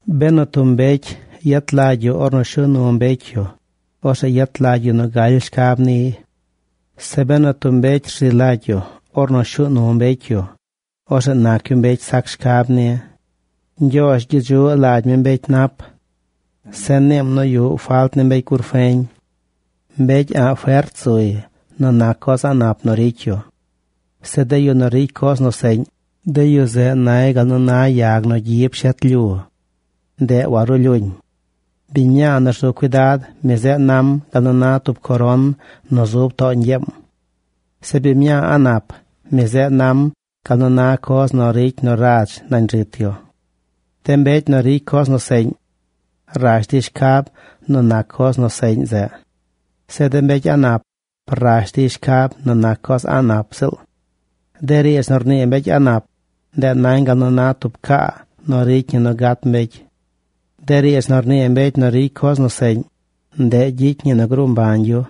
Benu tub mbecy yet lagy yu ornu shuu nu mbecy yu, orzeꞌ yet lagy yu nu galy shcab niy. Zeꞌ benu tub mbecy rzi lagy yu ornu shuu nu mbecy yu, orzeꞌ nac yu mbecy sac shcab ni. Ñgyoozh gyedzuꞌ lagy mi mbecy nap. Zeꞌ niim nu yuꞌ falt ni mbecy gur feñ. Mbecy a̱ꞌ fert zuy nu nac coz a̱ꞌ nap nu ricy yu. Zeꞌ de yu nu ricy coz nu seꞌñ, de yu zeꞌ nay gal na yag nu gyi pshet lyu. Ndeꞌ warulyuuñ. Biñ mñaa nu rzu cuidad, mi zeꞌ nam gal nu na tub coron nu zub too ñgyeem. Zeꞌ biñ mñaa a̱ꞌ nap, mi zeꞌ nam gal nu na coz nu ricy nu radz nañ rit yu. De mbecy nu ricy coz nu seꞌñ, rash dey shcab nu nac coz nu seꞌñ zeꞌ. Zeꞌ de mbecy a̱ꞌ nap rash dey shcab nu nac coz a̱ꞌ nap ziꞌl. De riidz nu rnii mbecy a̱ꞌ nap, ndeꞌ nañ gal nu na tub caa nu ricy ñi nu gat mbecy. De riidz nu rnii mbecy nu ricy coz nu seꞌñ, ndeꞌ gyicy ñi nu gruu mbañ yu.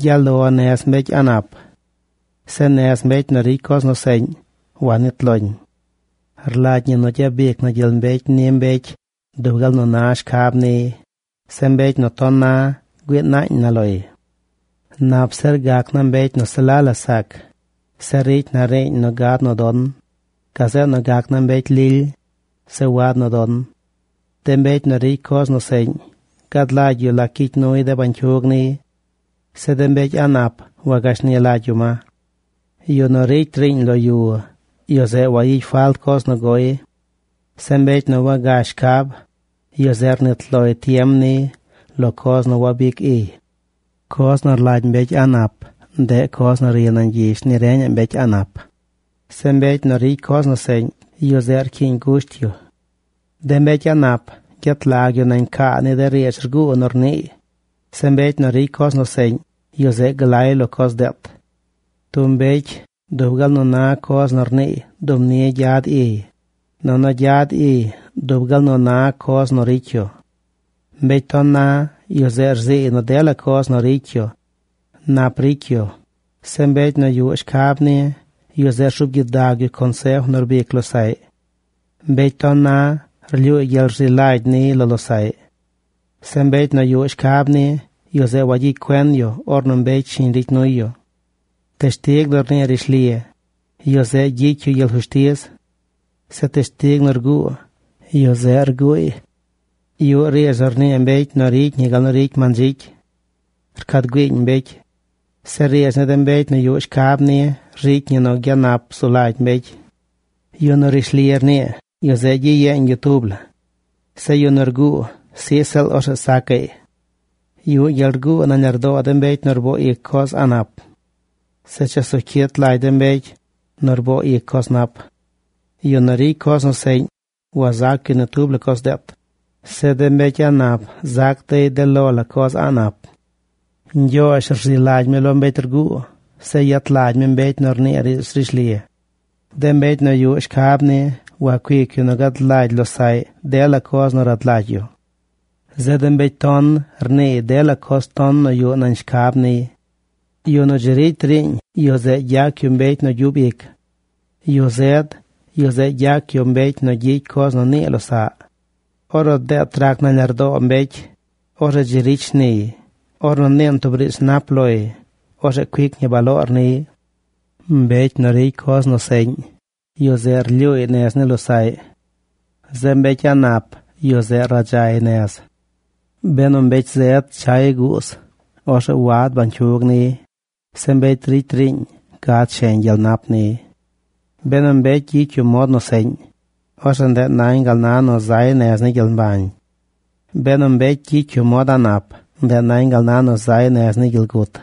Gyaꞌ lo nez mbecy a̱ꞌ nap. Zeꞌ nez mbecy nu ricy coz nu seꞌñ wanit loñ. Rlagy ñi nu gyabic na gyel mbecy ni mbecy dub gal nu na shcab niy. Zeꞌ mbecy nu ton na, güii naañ na loy. Nap zir gac naa mbecy nu se la la sac, zeꞌ ricy na riiñ nu gad nu don, gazeꞌ nu gac naa mbecy lily, zeꞌ wad nu don. De mbecy nu ricy coz nu seꞌñ gad lagy yu lac gyicy nuy de bañcyug niy. Zeꞌ de mbecy a̱ꞌ nap wagashni lagy yu ma. Yu nu ricy riiñ lo yu, yu zeꞌ wayicy falt coz nu goy. Zeꞌ mbecy nu wagash shcab, yu zeꞌ rnit loy tiem niy lo coz nu wabic iy. Coz nu rlagy mbecy a̱ꞌ nap, ndeꞌ coz nu ri nañ gyish ni reñaꞌ mbecy a̱ꞌ nap. Zeꞌ mbecy nu ricy coz nu seꞌñ, yu zeꞌ rcyiiñ gusht yu. De mbecy a̱ꞌ nap gyet lag yu nañ caa ni de riidz rguu nu rniiy. Zeꞌ mbecy nu ricy coz nu seꞌñ, yu zeꞌ glay lo coz deet. Tub mbecy dub gal nu na coz nu rniiy dub ni gyad iy, nunu gyad iy dub gal nu na coz nu ricy yu. Mbecy ton na, yu zeꞌ rziiy nu dela coz nu ricy yu nap ricy yu. Zeꞌ mbecy nu yuꞌ shcab ni, yu zeꞌ rzuub gyidag yu consef nu rbic losaꞌy. Mbecy ton na rlyuuy gyel rzi lagy niy lo losaꞌy. Zeꞌ mbecy nu yuꞌ shcab ni, yu zeꞌ wayicy cuen yu ornu mbecy shiñ ricy nuy yu. Teshtig nu rnii rishli, yu zeꞌ gyicy yu gyel fushtiz. Zeꞌ teshtig nu rguu, yu zeꞌ rguuy. Yuꞌ riidz nu rnii mbecy nu ricy ñi gal nu ricy mandzicy. Rcad güiiñ mbecy. Zeꞌ riidz ni de mbecy nu yuꞌ shcab ni ricy ñi nu gyanap zu lagy mbecy. Yu nu rishli rnii, yu zeꞌ gyiyeeñ yu tub la. Zeꞌ yu nu rguu, sij ziꞌl, orzeꞌ sacaꞌy. Yuꞌ gyel rguu nañ lardoo de mbecy nu rboo ic coz a̱ꞌ nap. Zeꞌ chesu cyit lagy de mbecy nu rboo ic coz nap. Yu nu ricy coz seꞌñ wazac yu ni tub la coz deet. Zeꞌ de mbecy a̱ꞌ nap zac dey de lo la coz a̱ꞌ nap. Ñgyoozh rzi lagy mi lo mbecy rguu. Zeꞌ yet lagy mi mbecy nu rnii riidz rishli. De mbecy nu yuꞌ shcab ni wacuic yu nu gad lagy losaꞌy dela coz nu rad lagy yu. Zeꞌ de mbecy ton rniiy dela coz ton nu yuꞌ nañ shcab niy. Yu nu dzi ricy riiñ, yu zeꞌ gyac yu mbecy nu gyub ic. Yu zed, yu zeꞌ gyac yu mbecy nu gyicy coz nu nii losaꞌy. Ornu deet rac nañ lardoo mbecy, orzeꞌ dzi ricy shniy. Ornu niin tub riidz nap loy, orzeꞌ cuic ñi baloor niy. Mbecy nu ricy coz nu seꞌñ, yu zeꞌ lyuuy nez ni losaꞌy. Zeꞌ mbecy a̱ꞌ nap yu zeꞌ gudzay nez. Benu mbecy zed chay guuz, orzeꞌ wagad bañcyug niy. Zeꞌ mbecy ricy riiñ gad sheñ gyel nap niy. Benu mbecy gyicy yu mod nu seꞌñ, orzeꞌ ndeꞌ nañ gal na nu zay nez ni gyel mbañ. Benu mbecy gyicy yu mod a̱ꞌ nap, ndeꞌ nañ gal na nu zay nez ni gyel gut.